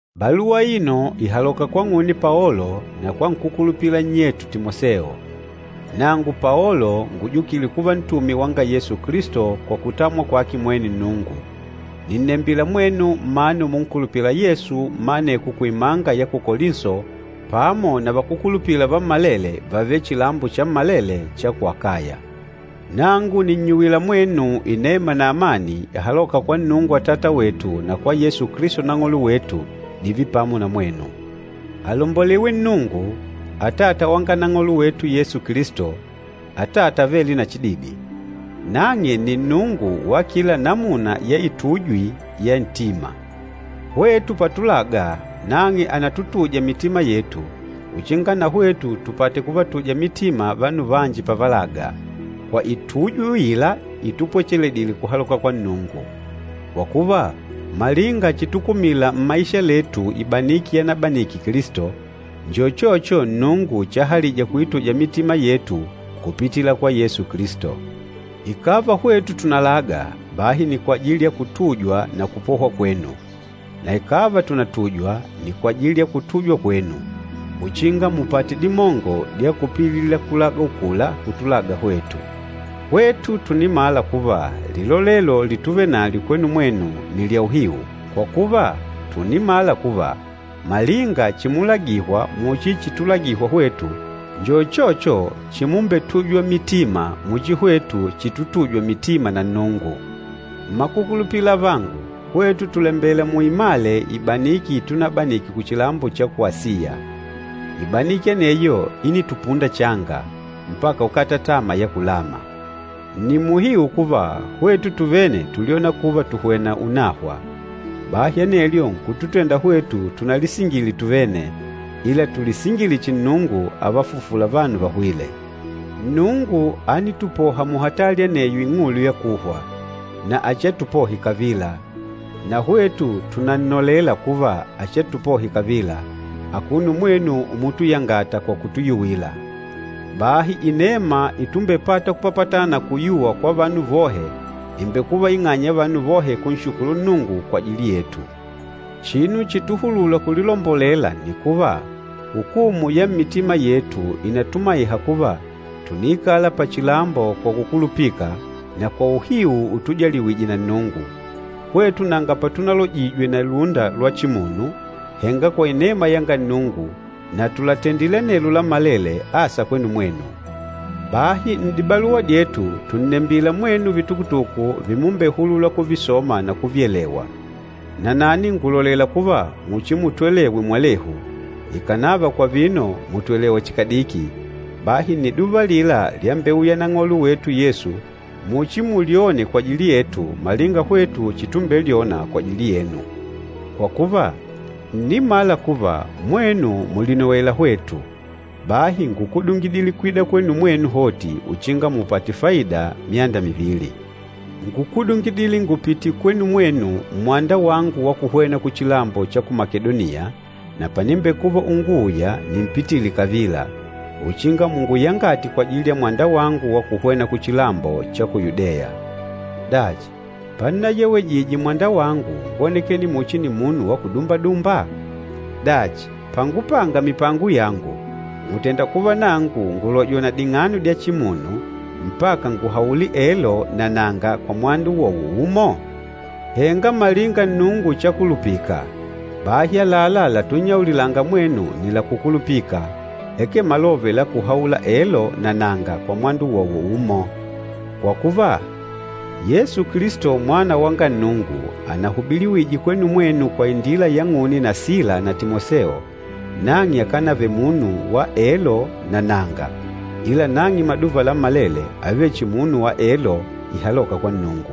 Baluwa aino ìhaloka kwang'une Paolo na kwa nkúkulupila nnyetu Timoseo. Nangu Paolo ngujukîle kuva ntume wanga Yesu Kilisto kwa kutamwa kwake mwene Nnungu, nìnnembila mwenu mmanu munkulupîla Yesu mma aneko kuimanga ya ku Kolinso pamo na vakúkulupila vammalele vavêle chilambo chammalele cha ku Akaya. Nangu nìnnyuwila mwenu inema na amani ihalôka kwa Nnungu Atata wetu na kwa Yesu Kilisto Nang'olo wetu, dììve pamo na mwenu. Alombolewe Nnungu, Atata wanga Nang'olo wetu Yesu Kilisto, Atata avêle na chididi. Nang'e nni Nnungu wa kila namuna ya itujwi ya ntima. Hwetu patulaga, nang'e ànatutuja mitima yetu, uchinga na hwetu tupate kuvatuja mitima vanu vanji pavalaga, kwa itujwi uila itupwecheledile kuhaloka kwa Nnungu. Kwa kuva, malinga chitukumila mmaisha letu ibaniki yanabanike Kilisto, njo uchocho Nnungu chahalija kuituja mitima yetu kupitila kwa Yesu Kilisto. Ikàva hwetu tùnalaga, bahi nni kwajili ya kutujwa na kupohwa kwenu. Na ikàva tùnatujwa, nni kwajili ya kutujwa kwenu, uchinga mupate dimongo dya kupililila kulaga ukula kutulaga hwetu. Hwetu tùnimala kuva lilolelo lituvenalyo kwenu mwenu nni lya uhiu, kwa kuva, tùnimala kuva, malinga chimulagihwa muchi chitulagihwa hwetu njo uchocho chimumbetujwa mitima muchi hwetu chitutujwa mitima na Nnungu. Mmakukulupila avangu, hwetu tùlembela muimale ibaniki itunabanike kuchilambo cha ku Asiya. Ibaniki aneyo ínitupunda changa, mpaka ukata tama ya kulama. Nni muhiu kuva, hwetu tuvene túlyona kuva tùhwena unahwa. Bahi anelyo nkututenda hwetu tunalisingile tuvene, ila tulisingile chihi Nnungu ávafufula vanu vahwîle. Nnungu ánitupoha muhatali aneyo ing'ulu ya kuhwa, na achiatupohe kavila. Na hwetu tùnannolela kuva achiatupohe kavila, akuno mwenu umutuyangata kwa kutuyuwila. Bahi inema itumbepata kupapatana na kuyuwa kwa vanu vohe ìmbekuva ing'anya ya vanu vohe kunshukulu Nnungu kwajili yetu. Chinu chituhulula kulilombolela nni kuva, hukumu ya mmitima yetu ìnatumaiha kuva tùniikala pachilambo kwa kukulupika na kwa uhiu utujaliwije na Nnungu. Hwetu nanga patunalojijwe na lúnda lwa chimunu, henga kwa inema yanga Nnungu, na tùlatendile anelo lammalele asa kwenu mwenu. Bahi n'dibaluwa dyetu tùnnembila mwenu vitukutuku vimumbehulula kuvisoma na kuvyelewa. Nanani ngùlolela kuva muchimutwelewe mwalehu, ikànava kwa vino mùtwelewa chihi kadiki. Bahi nniduva alila lyambeuya Nang'olo wetu Yesu muchimulyone kwajili yetu malinga hwetu chitumbelyona kwajili yenu. Kwa kuva, ńnimala kuva mwenu mùlinowela hwetu, bahi ngúkudungidile kwida kwenu mwenu hoti uchinga mupate faida myanda mivili. Ngúkudungidile ngùpitile kwenu mwenu mmwanda wangu wa kuhwena kuchilambo cha ku Makedoniya, na panimbekuva unguuya nimpitile kavila, uchinga munguyangate kwajili ya mwanda wangu wa kuhwena kuchilambo cha ku Yudeya. Dachi, pannayewejije mwanda wangu ngwónekene muchi nimunu wa kudumbadumba? Dachi, pangupanga mipango yangu mùtenda kuva nangu ngùlojwa na ding'ano dya chimunu mpaka nguhaule “Elo” na “Nanga” kwa mwanda uwowo umo? Henga malinga Nnungu chakulupika, bahi, àlalá latunnyaulilanga mwenu nni lakukulupika, akee malove lakuhaula “Elo” na “Nanga” kwa mwanda uwowo umo. Kwa kuva, Yesu Kilisto, Mwana wanga Nnungu, anahubiliwije kwenu mwenu kwa indila yang'une na Sila na Timoseo, nang'e akanavele munu wa “Elo” na “Nanga,” ila nang'e maduva lammalele ávele chihi munu wa “Elo” ihalôka kwa Nnungu.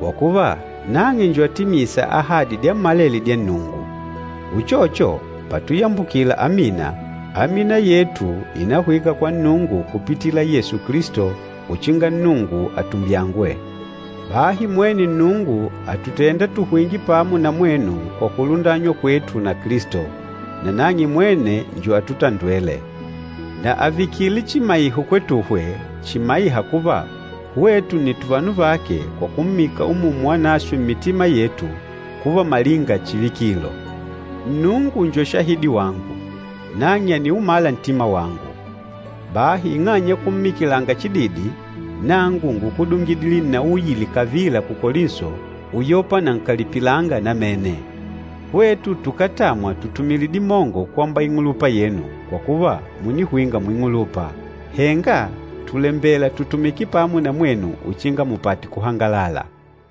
Kwa kuva, nang'e njo atimîsa ahadi dyammalele dya Nnungu. Uchocho, patuyambukila “Amina,” amina yetu ìnahwika kwa Nnungu kupitila Yesu Kilisto uchinga Nnungu atumbyangwe. Bahi mwene Nnungu àtutenda tuhwinge pamo na mwenu kwa kulundanywa kwetu na Kilisto, nanang'e mwene njo atutondwêle. Na àvikile chimaiho kwetuhwe chimaîha kuva hwetu nni tuvanu vake kwa kummika Umumu Wanaswe mmitima yetu kuva malinga chivikilo. Nnungu njo shahidi wangu, nang'e àniumala ntima wangu! Bahi ing'anya ya kummikilanga chididi, nangu ngúkudungidile nnauyile kavila ku Kolinso uyopa nankalipilanga namene. Hwetu tukátamwa tutumile dimongo kwamba ing'ulupa yenu, kwa kuva mùnihwinga muing'ulupa. Henga tùlembela tutumike pamo na mwenu uchinga mupate kuhangalala.